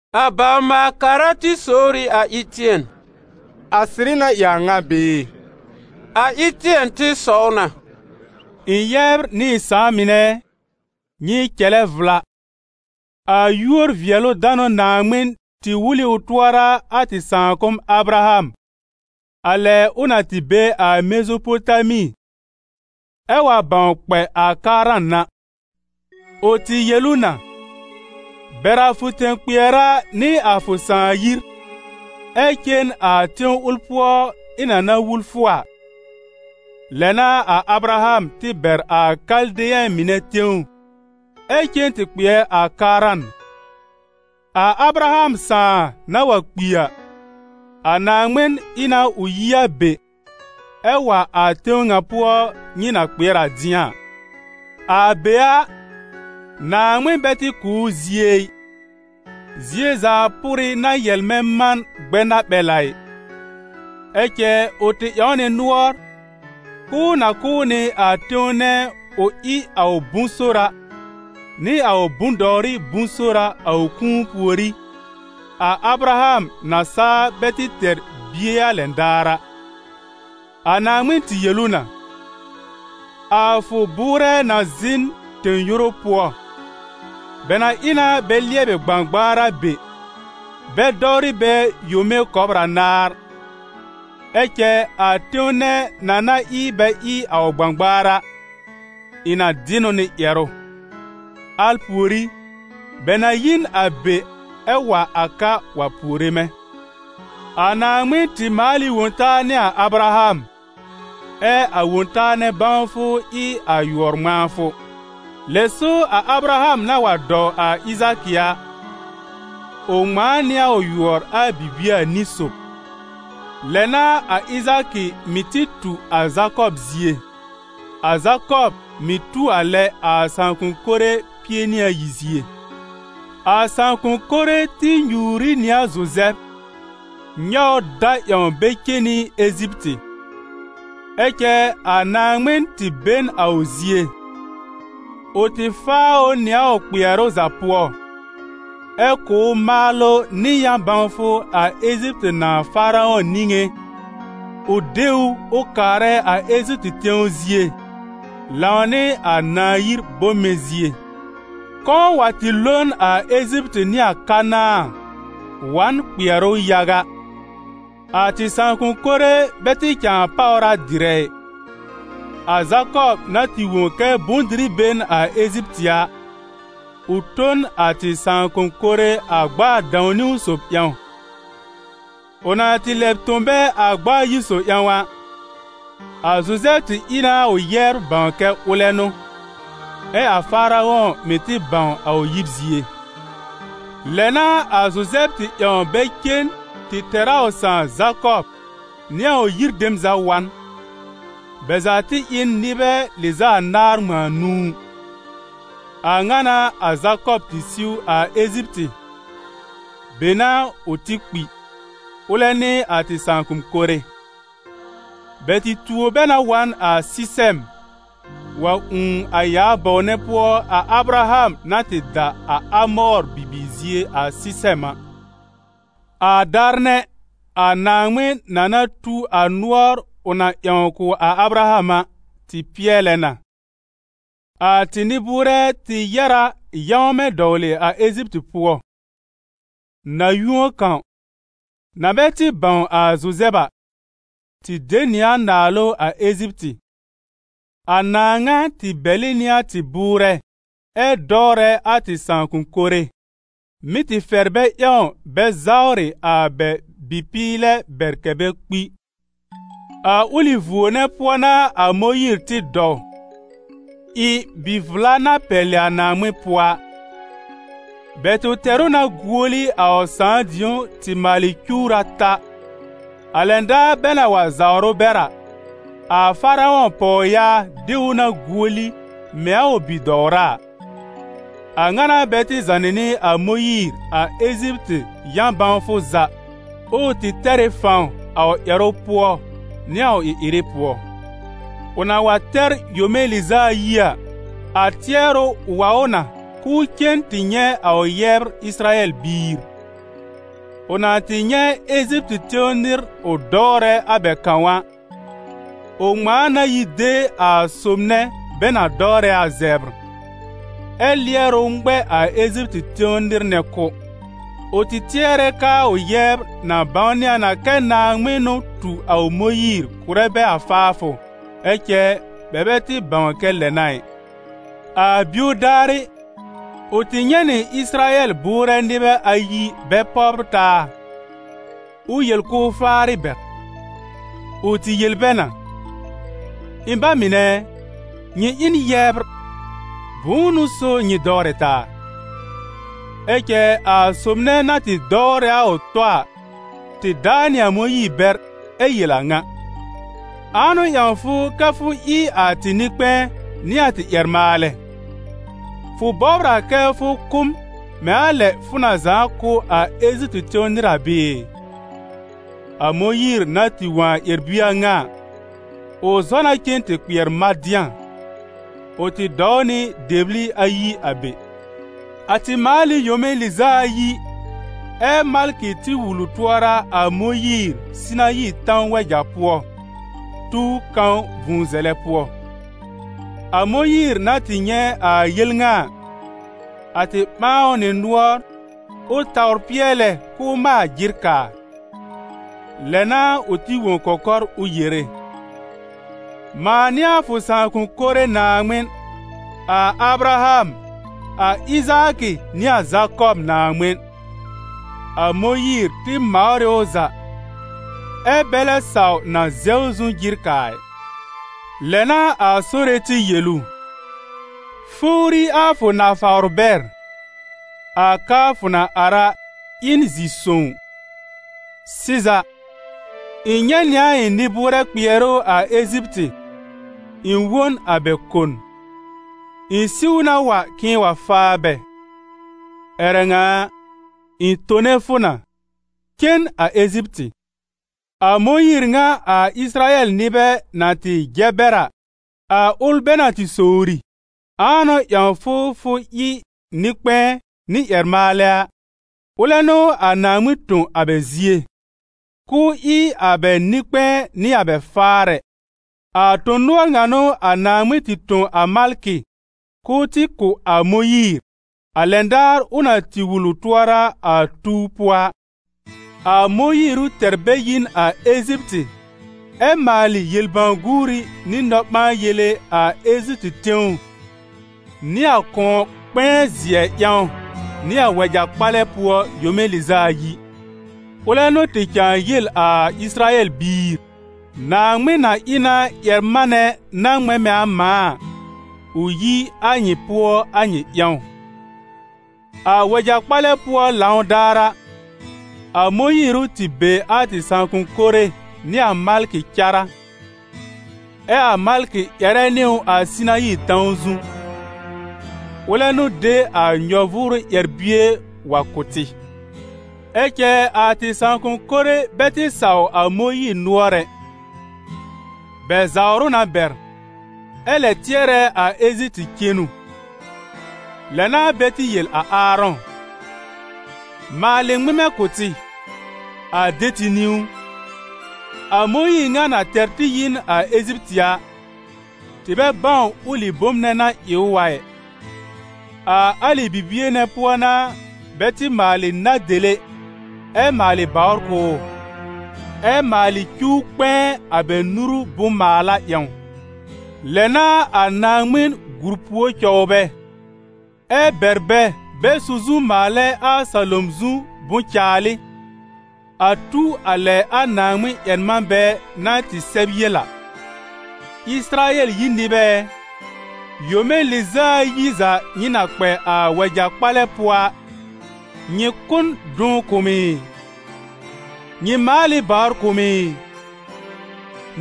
A bawr-maal-kara tɩ sowr ɩ a Ɩtɩɛn: «A sɩrɩ na ɩ a ŋa bɩɩ?» A Ɩtɩɛn tɩ sɔw na: «Ɩ̃ yɛbr nɩ ɩ̃ sãà mɩnɛ ɛ, nyɩ cɛlɛ vla, a yúor-vɩɛlʋ-danʋ Naaŋmɩn tɩ wul ɩ ʋ tʋɔra a tɩ sãakʋm Abraham, a lɛ ʋ na tɩ be a Mezopotami ɛ wa bãw kpɛ a Karan a. Ʋ tɩ yel ʋ na: ‹Bɛr a fʋ tẽ-kpɩɛra nɩ a fʋ sãà yir, ɛ cen a tẽw ʋl pʋɔ ɩ̃ na na wul fʋ a.› Lɛ n'a a Abraham tɩ bɛr a Kaldeyɛ̃ mɩnɛ tẽw ɛ cen tɩ kpɩɛr a Karan. A Abraham sãà na wa kpi a, a Naaŋmɩn ɩ na ʋ yi a be, ɛ wa a tẽw ŋa pʋɔ nyɩ na kpɩɛr a dɩ̃a a. A be a, Naaŋmɩn bɛ tɩ kʋ̀ ʋ zie ɩ, zie zaa pʋrɩ na yɛlmɛ man gbɛnaɓɛl a ɩ. Ɛ cɛ ʋ tɩ ƴãw nɩ nʋɔr k'ʋʋ na kʋ̀ ʋ nɩ a tẽw nɛ ʋ ɩ a ʋ bʋ̃-sora, nɩ a ʋ bʋ̃-dɔwrɩ bʋ̃-sora a ʋ kũu pùorí, a Abraham na saa bɛ tɩ tɛr bie a lɛn daar a. A Naaŋmɩn tɩ yel ʋ na: ‹A fʋ bʋʋrɛ na zɩ̃ n tẽ-yoru pʋɔ, bɛ na ɩ na bɛ lɩɛbɩ gbãgbaar a be, bɛ dɔwrɩ bɛ yome kɔbr anaar. Ɛ cɛ a tẽw nɛ na na ɩ bɛ ɩ a ʋ gbãgbaar a, ɩ̃ na dɩ n ʋ nɩ ƴɛrʋ. Al pùorí, bɛ na yi n a be ɛ wa a ka wa puore mɛ̃.› A Naaŋmɩn tɩ maal ɩ Wõ-taa nɩ a Abraham, ɛ a Wõ-taa nɛ bãwfʋ ɩ a yʋɔr-ŋmãafʋ. Lɛ so a Abraham na wa dɔw a Ɩzaakɩ a, ʋ ŋmãa nɩ a ʋ yʋɔr a bibie anĩ sob. Lɛ n'a a Ɩzaakɩ mɩ̀ tɩ tu a Zakɔb zie, a Zakɔb mɩ̀ tu a lɛ a sãakʋ̃-kore pie nɩ ayi zie.» «A Sãakʋ̃-kore tɩ nyuur ɩ nɩ a Zuzɛb, nyɔw ʋ da ƴãw bɛ cen nɩ Eziptɩ. Ɛ cɛ a Naaŋmɩn tɩ be n a ʋ zie. Ʋ tɩ faa ʋ nɩ a ʋ kpɩɛrʋ za pʋɔ, ɛ kʋ̀ ʋ maalʋ nɩ yã-bãwfʋ a Eziptɩ nãà Faarɔ̃ niŋé, ʋ de ʋ ʋ kaarɛ a Eziptɩ tẽw zie, lãw nɩ a nãà yir bome zie. Kɔ̃ wa tɩ lo n a Eziptɩ nɩ a Kanãa, wa n kpɩɛrʋ yaga. A tɩ sãakʋm mɩnɛ bɛ tɩ cãa páwr a dɩrɛ ɩ. A Zakɔb na tɩ wõ kɛ bʋ̃-dɩrɩ be n a Eziptɩ a, ʋ tõ n a tɩ sãakʋm mɩnɛ a gb'a a dãw-niwn sob ƴãw. Ʋ na tɩ lɛb tõ bɛ a gb'a ayi sob ƴãw a, a Zuzɛb tɩ ɩ na a ʋ yɛbr bãw kɛ ʋlɛ n'ʋ, ɛ a Faarɔ̃ mɩ̀ tɩ bãw a ʋ yib zie. Lɛ n'a a Zuzɛb tɩ ƴãw bɛ cen tɩ tɛr a ʋ sãà Zakɔb nɩ a ʋ yir dem za wa n; bɛ za tɩ ɩ n nɩbɛ lɩz'a anaar ŋmãa nũu. A ŋa n'a a Zakɔb tɩ siw a Eziptɩ, be n'a ʋ tɩ kpi, ʋlɛ nɩ a tɩ sãakʋm mɩnɛ. Bɛ tɩ tuo bɛ na wa n a Sɩsɛm, wa ũù a yaa bɔw nɛ pʋɔ a Abraham na tɩ da a Amɔɔr bibiir zie a Sɩsɛm a.» «A daar nɛ, a Naaŋmɩn na na tu a nʋɔr ʋ na ƴãw kʋ̀ a Abraham a, tɩ pɩɛlɛ na. A tɩ nɩ-bʋʋrɛ tɩ yɛ̀r a yãwmɛ dɔwlɩ a Eziptɩ pʋɔ. Na-yũo kãw, na bɛ tɩ bãw a Zuzɛb a, tɩ de nɩ a naalʋ a Eziptɩ. A nãà ŋa tɩ bɛlɩ nɩ a tɩ bʋʋrɛ ɛ dɔwrɛ a tɩ sãakʋm mɩnɛ, mɩ́ tɩ fɛr bɛ ƴãw bɛ zawrɩ a bɛ bɩ-pɩɩlɛ bɛr kɛ́ bɛ kpi. A ʋlɩ vuo nɛ pʋɔ n'a a Mõyiir tɩ dɔw, ɩ bi-vla na pɛlɩ a Naaŋmɩn pʋɔ a. Bɛ tɩ tɛr ʋ na guoli a ʋ sãà dĩ̀ó tɩ maalɩ cuwr ata. A lɛn daar bɛ na wa zawr ʋ bɛr a, a Faarɔ̃ pɔwyaa de ʋ na guoli mɛ̃ a ʋ bi-dɔwra a. A ŋa n'a bɛ tɩ zànɩ nɩ a Mõyiir a Eziptɩ yã-bãwfʋ za, ʋʋ tɩ tɛr ɩ fãw a ʋ ƴɛrʋ pʋɔ nɩ a ʋ ɩ-ɩrɩ pʋɔ. Ʋ na wa tɛr yome lɩz'a ayi a, a tɩɛrʋ wa ʋ na k'ʋʋ cen tɩ nyɛ̃ a ʋ yɛbr Ɩsɩrayɛl biir. Ʋ na tɩ nyɛ̃ Eziptɩ tẽw nɩr ʋ dɔwrɛ a bɛ kãw a, ʋ ŋmãa na yi de a sob nɛ bɛ na dɔwrɛ a zɛbr, ɛ lɩɛr ʋ ŋmɛ a Eziptɩ tẽw nɩr nɛ kʋ́. Ʋ tɩ tɩɛrɛ k'aa ʋ yɛbr na bãwnɩ a na kɛ Naaŋmɩn n'ʋ tu a ʋ Mõyiir kʋ̀rɛ bɛ a faafʋ, ɛ cɛ bɛ bɛ tɩ bãw kɛ lɛ n'a ɩ. A bio daarɩ, ʋ tɩ nyɛ̃ nɩ Ɩsɩrayɛl bʋʋrɛ nɩbɛ ayi bɛ pɔbr taa, ʋ yel k'ʋʋ faarɩ bɛr. Ʋ tɩ yel bɛ na: ‹Ɩ̃ ba mɩnɛ ɛ, nyɩ ɩ n yɛbr, bʋ̃ʋ n'ʋ so nyɩ dɔwrɛ taa?› Ɛ cɛ a sob nɛ na tɩ dɔwrɛ a ʋ tɔ a tɩ daa nɩ a Mõyiir bɛr ɛ yel a ŋa: ‹Ãa n'ʋ ƴãw fʋ kɛ́ fʋ ɩ a tɩ nɩ-kpɛ̃ɛ nɩ a tɩ ƴɛr-maalɛ? Fʋ bɔbr a kɛ fʋ kʋ́ m mɛ̃ a lɛ fʋ na zãa kʋ́ a Eziptɩ tẽw nɩr a bɩɩ?› A Mõyiir na tɩ wõ a ƴɛr-bie a ŋa a, ʋ zɔ na cen tɩ kpɩɛr Madɩ̃a. Ʋ tɩ dɔw nɩ dɛbli ayi a be.» «A tɩ maal ɩ yome lɩz'a ayi, ɛ́ malkɩ tɩ wul ʋ tʋɔra a Mõyiir Sɩnayi tãw wɛja pʋɔ, tuw kãw vũu zɛlɛ pʋɔ. A Mõyiir na tɩ nyɛ̃ a yel ŋa a, a tɩ ɓãa ʋ nɩ nʋɔr ʋ tawr pɩɛlɛ k'ʋʋ maal jɩr kaa. Lɛ n'a ʋ tɩ wõ kɔkɔr ʋ yere: ‹Mãa n'ɩ a fʋ sãakʋm mɩnɛ Naaŋmɩn, a Abraham, a Ɩzaakɩ nɩ a Zakɔb Naaŋmɩn.› A Mõyiir tɩ mawr ɩ ʋ za, ɛ́ bɛ lɛ saw na zɛw zu jɩr kaa ɩ. Lɛ n'a a Sore tɩ yel ʋ: ‹Fowri a fʋ nafawr bɛr, a ka fʋ na ar a, ɩ n zi-sõw. Sɩza, ɩ̃ nyɛ̃ nɩ a ɩ̃ nɩ-bʋʋrɛ kpɩɛrʋ a Eziptɩ, ɩ̃ wõ n a bɛ kon. Ɩ̃ siw na wa k'ɩ̃ɩ wa faa bɛ. Ƴɛrɛ ŋa a, ɩ̃ tone fʋ na, cen a Eziptɩ.›» «A Mõyiir ŋa a Ɩsɩrayɛl nɩbɛ na tɩ jɛ bɛr a, a ʋl bɛ na tɩ sowri: ‹Ãa n'ʋ ƴãw fʋ fʋ ɩ nɩ-kpɛ̃ɛ nɩ ƴɛr-maalɛ a?› Ʋlɛ n'ʋ a Naaŋmɩn tõ a bɛ zie, k'ʋʋ ɩ a bɛ nɩ-kpɛ̃ɛ nɩ a bɛ faarɛ. A tõ-nʋɔr ŋa n'ʋ a Naaŋmɩn tɩ tõ a malkɩ k'ʋʋ tɩ kʋ̀ a Mõyiir, a lɛn daar ʋ na tɩ wul ʋ tʋɔra a tuw pʋɔ a. A Mõyiir ʋ tɛr bɛ yi n a Eziptɩ ɛ maalɩ yel-bãw-guuri nɩ nɔ-ɓãa-yele a Eziptɩ tẽw nɩ a Kʋ̃ɔ-kpɛ̃ɛ-zɩɛ ƴãw nɩ a wɛja-kpalɛ pʋɔ yome lɩz'a ayi. Ʋlɛ n'ʋ tɩ cãa yel a Ɩsɩrayɛl biir: ‹Naaŋmɩn na ɩ na ƴɛr-manɛ na ŋmɛ̃ mɛ̃ a mãa a, ʋ yi a nyɩ pʋɔ a nyɩ ƴãw.› A wɛja-kpalɛ pʋɔ lãw daar a, a Mõyiir ʋ tɩ be a tɩ sãakʋm mɩnɛ nɩ a malkɩ cárá, ɛ a malkɩ ƴɛrɛ nɩ ʋ a Sɩnayi tãw zu. Ʋlɛ n'ʋ de a nyɔ-vʋʋrʋ ƴɛr-bie wa kʋ̀ tɩ. Ɛ cɛ a tɩ sãakʋm mɩnɛ bɛ tɩ saw a Mõyiir nʋɔr ɛ; bɛ zawr ʋ na bɛr, ɛ lɛ tɩɛrɛ a Eziptɩ cenu. Lɛ n'a bɛ tɩ yel a Aarɔ̃: ‹Maalɩ ŋmɩmɛ kʋ̀ tɩ, a de tɩ niwn. A Mõyiir ŋa na tɛr tɩ yi n a Eziptɩ a, tɩ bɛ bãw ʋlɩ bom nɛ na ɩ ʋ a ɩ.› A alɩ bibie nɛ pʋɔ n'a bɛ tɩ maalɩ na-dele ɛ maalɩ bawr kʋ̀ ʋ, ɛ maalɩ cuw kpɛ̃ɛ a bɛ nuru bʋ̃-maala ƴãw. Lɛ n'a a Naaŋmɩn gùr pùor cɔw bɛ, ɛ bɛr bɛ bɛ su zu maalɛ a salom zu bʋ̃-caalɩ, a tu a lɛ a Naaŋmɩn-ƴɛr-manbɛ na tɩ sɛb yel a: ‹Ɩsɩrayɛl yir nɩbɛ ɛ, yome lɩz'a ayi za nyɩ na kpɛ a wɛja-kpalɛ pʋɔ a, nyɩ kʋ́ n dʋn kʋ̀ m ɩ? Nyɩ maal ɩ bawr kʋ̀ m ɩ?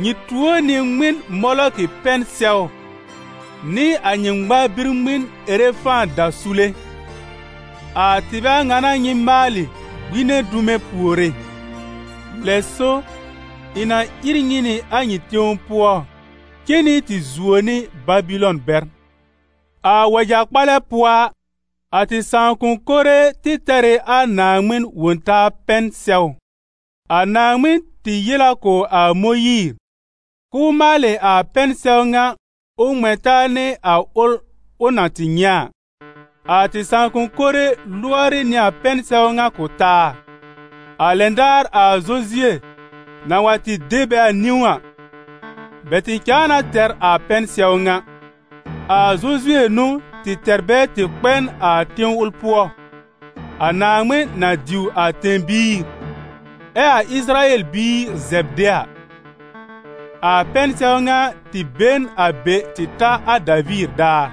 Nyɩ tuo nɩ ŋmɩn Molɔkɩ pɛn-sɛw nɩ a nyɩ ŋmar-bi-ŋmɩn Erefã dasule. A tɩbɛ a ŋa n'a nyɩ maalɩ gbine dume puore. Lɛ so, ɩ̃ na ír nyɩ nɩ a nyɩ tẽw pʋɔ cen nɩ tɩ zuo nɩ Babɩlɔn bɛr.›» «A wɛja-kpalɛ pʋɔ a, a tɩ sãakʋm mɩnɛ tɩ tɛr ɩ a Naaŋmɩn Wõ-taa pɛn-sɛw. A Naaŋmɩn tɩ yel a kʋ̀ a Mõyiir k'ʋʋ maalɩ a pɛn-sɛw ŋa ʋ ŋmɛ̃ taa nɩ a ʋl ʋ na tɩ nyɛ̃ a. A tɩ sãakʋm mɩnɛ lʋɔrɩ nɩ a pɛn-sɛw ŋa kʋ̀ taa. A lɛn daar a Zozue na wa tɩ de bɛ a niwn a, bɛ tɩ cãa na tɛr a pɛn-sɛw ŋa. A Zozue n'ʋ tɩ tɛr bɛ tɩ kpɛ n a tẽw ʋl pʋɔ, a Naaŋmɩn na diw a tẽ-biir, ɛ a Ɩsɩrayɛl biir zɛb de a. A pɛn-sɛw ŋa tɩ be n a be tɩ ta a Daviir daar.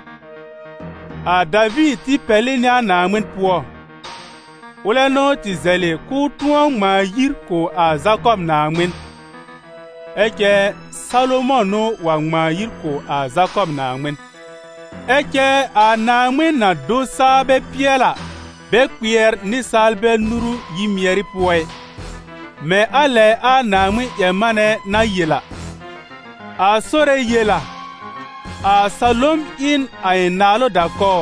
A Daviir tɩ pɛlɩ nɩ a Naaŋmɩn pʋɔ. Ʋlɛ n'ʋ tɩ zɛlɩ k'ʋʋ tʋ̃ɔ ŋmãa yir kʋ̀ a Zakɔb Naaŋmɩn. Ɛ cɛ Salomɔ̃ n'ʋ wa ŋmãa yir kʋ̀ a Zakɔb Naaŋmɩn. Ɛ cɛ a Naaŋmɩn-na-do-saa-bɛ-pɩɛl-a, bɛ kpɩɛr nɩsaalbɛ nuru yi-mɩɛrɩ pʋɔ ɩ, mɛ̃ a lɛ a Naaŋmɩn-ƴɛr-manɛ na yel a: ‹A Sore yel a: a salom ɩ n a ɩ̃ naalʋ da-kɔw,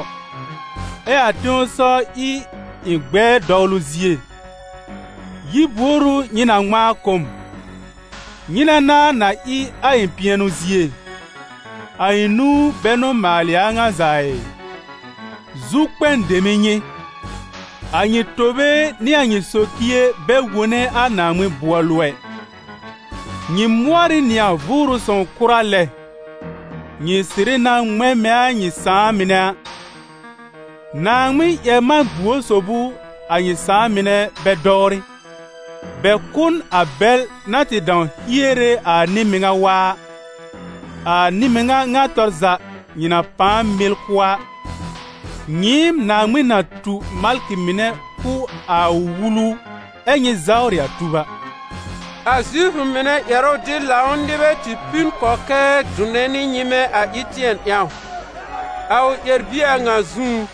ɛ a tẽsɔw ɩ a ɩ̃ gbɛɛ dɔwlʋ zie. Yir buor ʋ nyɩ na ŋmãa kʋ̀ m? Nyɩnɛ n'a na ɩ a ɩ̃ pɩɛnʋ zie? A ɩ̃ nũu bɛ n'ʋ maalɩ a a ŋa za a ɩ?›» «Zukpɛn dem n'ɩ nyɩ! A nyɩ tobe nɩ a nyɩ socie bɛ wone a Naaŋmɩn bʋɔlʋ ɛ. Nyɩ mʋɔr ɩ nɩ a Vʋʋrʋ Sõw kʋra lɛ. Nyɩ sɩrɩ na ŋmɛ̃ mɛ̃ a nyɩ sãà mɩnɛ a. Naaŋmɩn-ƴɛr-man-buor sob ʋ a nyɩ sãà mɩnɛ bɛ dɔwrɩ? Bɛ kʋ́ n a bɛl na tɩ dãw hiere a nɩ-mɩŋa waa a. A Nɩ-mɩŋa ŋa tɔr za nyɩ na pãa mɩl kʋ́ a, nyɩɩm Naaŋmɩn na tu malkɩ mɩnɛ kʋ̀ a ʋ Wulu ɛ́ nyɩ zawrɩ a tub a.» A Zifʋ mɩnɛ ƴɛrʋ-dɩb-lãw nɩbɛ tɩ pi n kɔkɛɛ dʋnɛ nɩ nyɩmɛ a Ɩtɩɛn ƴãw, a ʋ ƴɛr-bie a ŋa zũú.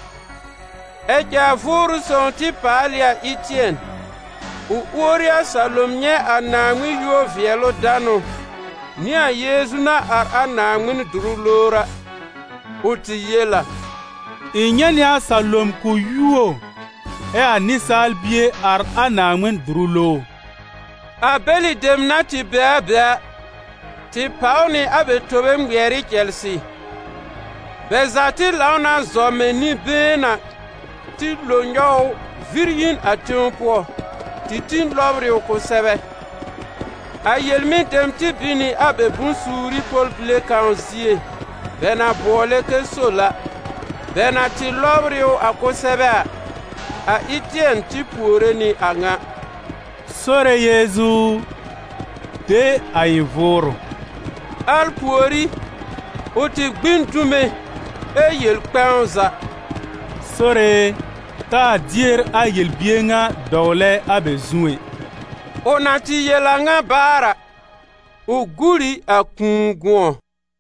Ɛ cɛ a Vʋʋrʋ Sõw tɩ paal ɩ a Ɩtɩɛn, ʋ uori a salom nyɛ̃ a Naaŋmɩn yúor-vɩɛlʋ-danʋ nɩ a Yeezu na ar a Naaŋmɩn dʋrʋ lowr a. Ʋ tɩ yel a: «Ɩ̃ nyɛ̃ nɩ a salom k'ʋ yuo, ɛ a Nɩsaal Bie ar a Naaŋmɩn dʋrʋ lowr.» A bɛlɩ dem na tɩ be a be a, tɩ pàw nɩ a bɛ tobe ŋmɩɛr ɩ cɛlsɩ. Bɛ za tɩ lãw na zɔ mɛ̃ nɩ-been a tɩ lo nyɔw ʋ vɩr yi n a tẽw pʋɔ, tɩ tĩ lɔbr ɩ ʋ kʋsɛbɛ. A yel-mɩn-dem tɩ bin nɩ a bɛ bʋ̃-suuri pɔl-bile kãw zie bɛ na bʋɔlɛ kɛ Sol a. Bɛ na tɩ lɔbr ɩ ʋ a kʋsɛbɛ a, a Ɩtɩɛn tɩ puore nɩ a ŋa: «Sore Yeezu u, de a ɩ̃ vʋʋrʋ!» Al pùorí, ʋ tɩ gbĩ n dume ɛ yel kpɛ̃w za: «Sore e, taa dier a yel-bier ŋa dɔwlɛ a bɛ zu ɛ.» Ʋ na tɩ yel a ŋa baar a, ʋ gur ɩ a kũu gʋ̃ɔ.